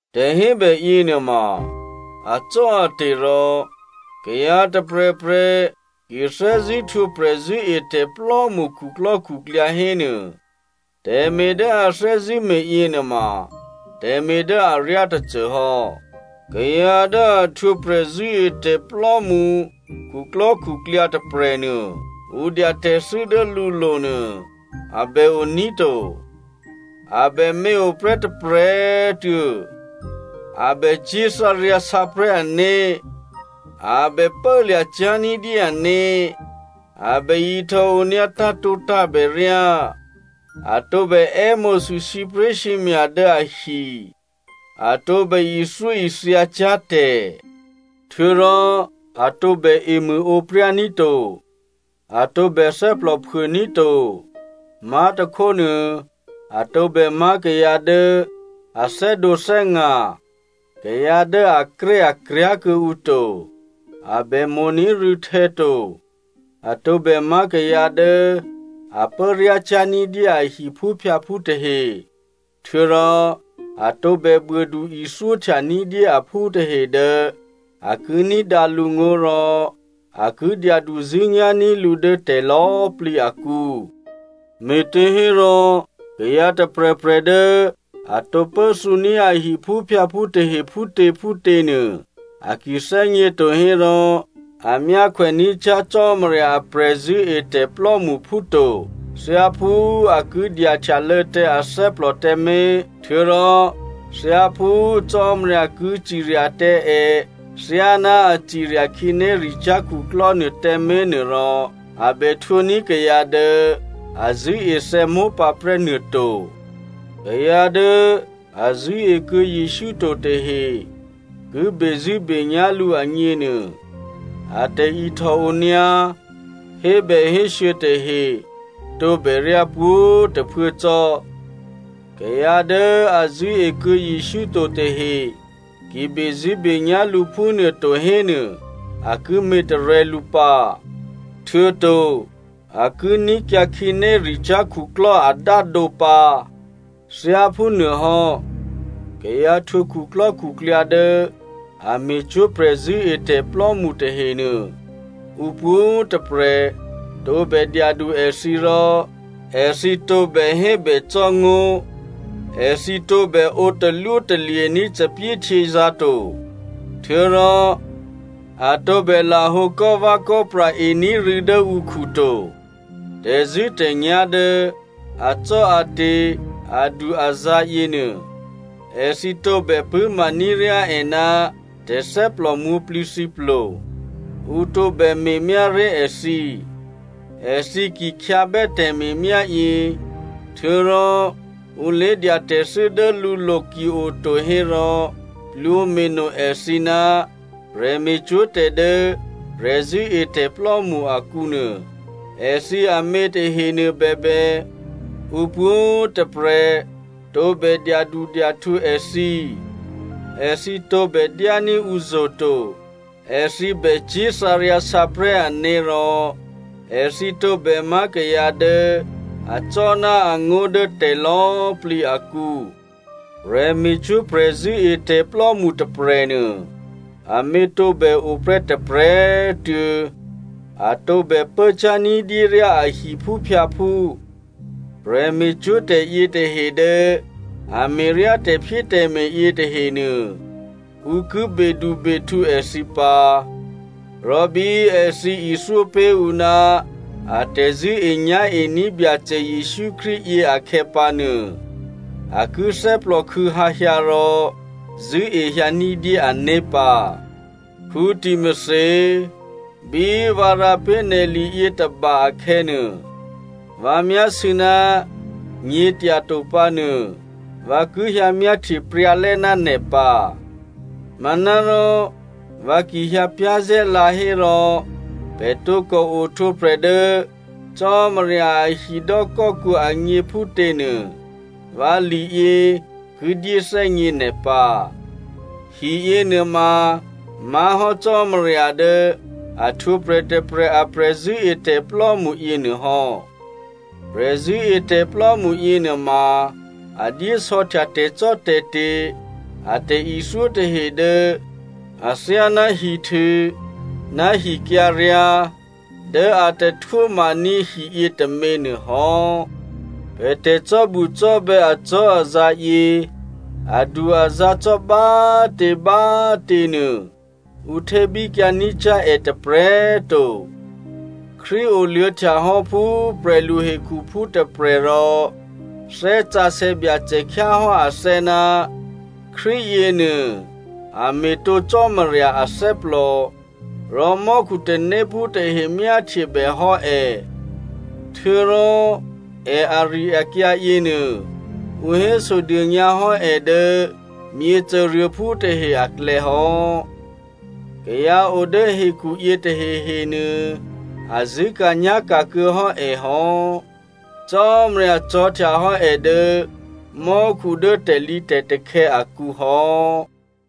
Tè̤hébè yěnuôma acò́ate̤ rò kayǎ tôprè̤prè̤ ki thè́zṳ̂́ htwǒ prè̤zṳ̂́etè̤plò́mṳ khuklò́khuklyǎ hénuô, tè̤me̤ dố a thè́zṳ̂́me̤ yěnuôma tè̤me̤ dố aryá tôcô hò́. Kayǎ dố a htwǒ prè̤zṳ̂́etè̤plò́mṳ khuklò́khuklyǎ tôprè̤nuô, ǔ dya tè̤thû́ dố lǔlo̤ nuô a bè oní̤ to, a bè měoprè́ tôprè̤꤮ tuô̌, a bè cyé̤thǎryǎsǎprè̤́ ané̤, a bè pốlya̤cyá̤ ní̤dyé ané̤, a bè ihtòonyǎ tǎ̤tǒtǎ̤bèryá, a tǒbè è́mo̤sû sǐpré̤sǐmya̤ dố ahi, a tǒbè ithyóithyacyá̤ tè̤. Htuô̌rò a tǒbè emṳ̂ǒpryá ní̤ to, a tǒbè thè́plòphuô ní̤ to, má̤tôkhónuô a tǒbè má̤ kayǎ dố a thè́dǒthè́nga̤, kayǎ dố akréakryá̤ kuô̌ǔ to, a bèmo̤ní̤ rû̌htè̌ to. A tǒbè má̤ kayǎ dố a pốryácyá̤ ní̤dyé a hiphúphyǎphú tahe htuô̌rò a tǒbè buôdu ithyóhtya ní̤dyé aphú tahe dố a ki ní̤dǎ lǔ ngó̤ rò a ki dyaduzṳ̂́nyá̤ní̤ lǔ dố tè̤lò̌꤮ plǐ akǔ. Me̤těhérò kayǎ tôprè̤prè̤ dố a tǒpốthǔní̤ a hiphúphyǎphú tahe phútě phútěnuô, a ki thè́gně to hérò a myákhwè ní̤cyá̤ Cò́marya a prè̤zṳ̂́etè̤ plò́mṳphú to. Thyáphú a ki dyahtyalô̌ tǎ athè́plò tǎmé̤, htuô̌rò thyáphú Cò́marya ki cirya tǎ è thyáná a cirya khǐnéricyá̤ khuklò́ nuôtǎmé̤ nuôrò, a bè htwǒní̤ kayǎ dố a zṳ̂́ethè̌ mópǎprè́ nuôto. Kayǎ dố a zṳ̂́ekuô̌ Jesǔ to tahe ki bezṳ̂́benyá̤ lǔ agněnuô, a tè̤ihtòonyǎ hébèhésû̌ tahe tǒbè ryá pwǒ̤꤮ tôphuố cò́. Kayǎ dố a zṳ̂́ekuô̌ Jesǔ to tahe ki bezṳ̂́benyá̤ lǔ phúnuôto hénuô, a ki me̤tarè̤̌ lǔ pǎ, htuô̌to a ki ní̤kyǎ khǐnéricyá̤ khuklò́ adádǒ pǎ. Thyáphúnuôhò́ kayǎ htwǒ khuklò́khuklyǎ dố a me̤cwó̤ prè̤zṳ̂́etè̤plò́mṳ tahenuô, ǔ pwǒ̤꤮ tôprè̤ tǒbè dyadu èthǐ, rò èthǐ tǒbè hébècò́ ngó̤, èthǐ tǒbè ǒ talwótalye̤ní̤ thòbǐthèhtyězǎ̤ to, htuô̌rò a tǒbè lahǒ kò́vè̌kò́pra ení̤ rû̌ dố ǔkhu to. Tè̤zṳ̂́tè̤nyá̤ dố acò́ate̤ adu-azǎ̤ yěnuô, èthǐ tǒbè pṳ̂́maní̤ ryá è ná tè̤thè́plò mwǒ̤plǐthǐplo. Ǔ tǒbè me̤myáré̤ èthǐ. Èthǐ ki khyǎbè́ tè̤me̤myáyě, htuô̌rò ǔ lé̤dya tè̤thû́ dố lǔlo̤ ki oto hérò plwǒme̤no èthǐ ná prè̤me̤cwó̤ tè̤dố prè̤zṳ̂́etè̤plò́mṳ akǔnuô. Èthǐ amě tahenuô bèbè, ǔ pwǒ̤꤮ tôprè̤ tǒbè dyadudyahtǔ èthǐ, èthǐ tǒbè dyání̤ ǔzo̤ to, èthǐ bècyé̤ thǎryǎsǎprè̤́ ané̤ rò èthǐ tǒbèmá̤ kayǎ dố acò́ ná angó̤ dố tè̤lò̌꤮ plǐ akǔ. Prè̤me̤cwó̤ prè̤zṳ̂́etè̤plò́mṳ tôprè̤nuô amě tǒbè oprè́ tôprè̤꤮ tuô̌, a tǒbè pốcyá̤ ní̤dyé ryá a hiphúphyǎphú. Prè̤me̤cwó̤tè̤ yětahe dố a me̤ryá tè̤phyétè̤me̤ yětahenuô, ǔ ki bedubehtǔ èthǐ pǎ, rò bí èthǐ ithyó pé̤ ǔ ná a tè̤zṳ̂́enyá̤ení̤ Byacè Jesǔ Krístu yě akhè̌pǎnuô, a ki thè́plòkhû̌hǎ hyǎ rò zṳ̂́ehyǎ ní̤dyé ané̤ pǎ. Timothy꤮, bí vǎ rǎ pé̤ nè̤ li yětôba akhè̌nuô, vǎ myásû̌ ná nyě̤tyato pǎnuô, vǎ ki hyǎ myáhtye pryǎlè́ ná nè̤ pǎ. Manárò vǎ ki hyǎ pyá̤zè̤́lǎ hérò pè̤ tǒkò ohtwǒprè̤ dố Cò́marya a hidò́kò́kǔ agně phútě nuô, vǎ liyě ki dyéthè́gně nè̤ pǎ. Hiyě nuôma má̤ hò́ Cò́marya dố a htwǒprè̤ tôprè̤ a prè̤zṳ̂́etè̤plò́mṳ yěnuôhò́. Prè̤zṳ̂́etè̤plò́mṳ yěnuôma a dyé sò̌htya tè̤cò́tè̤te̤ a tè̤ithyó tahe dố athyáná hihtû ná hikyǎryǎ̤ dố a tahtwó maní̤ hiyě tômě nuôhò́. Pè̤ tè̤cò́bucò́bè̌ acò́azǎ̤yě adu-azǎ̤ cò́ bá꤮ tě bá꤮ těnuô ǔ htébíkyǎ ní̤cyá̤ è tôprè̤꤮ to. Krístu oluô̌htya hò́ phú prè̤lu hekhuphú tôprè̤, rò Thè́ Sǎsè̌ Byacè khyáhò́ athè́ ná Krístu yěnuô a me̤tǒ Cò́marya athè́plò, rò mò́khu tanéphú tahe myáhtyebè hò́ è. Htuô̌rò è ari-akyǎ yěnuô, ǔ hésodônyǎ hò́ è dố myěcôruôphú tahe aklè̌hò́. Kayǎ o dố hekhuyě tahehe nuô a zṳ̂́ka̤nyá̤ka̤ kuô̌ hò́ è hò́. Cò́marya cò̤̌htyahò́ è dố mò́khu dố tè̤lǐtè̤takhè̌ akǔhò́.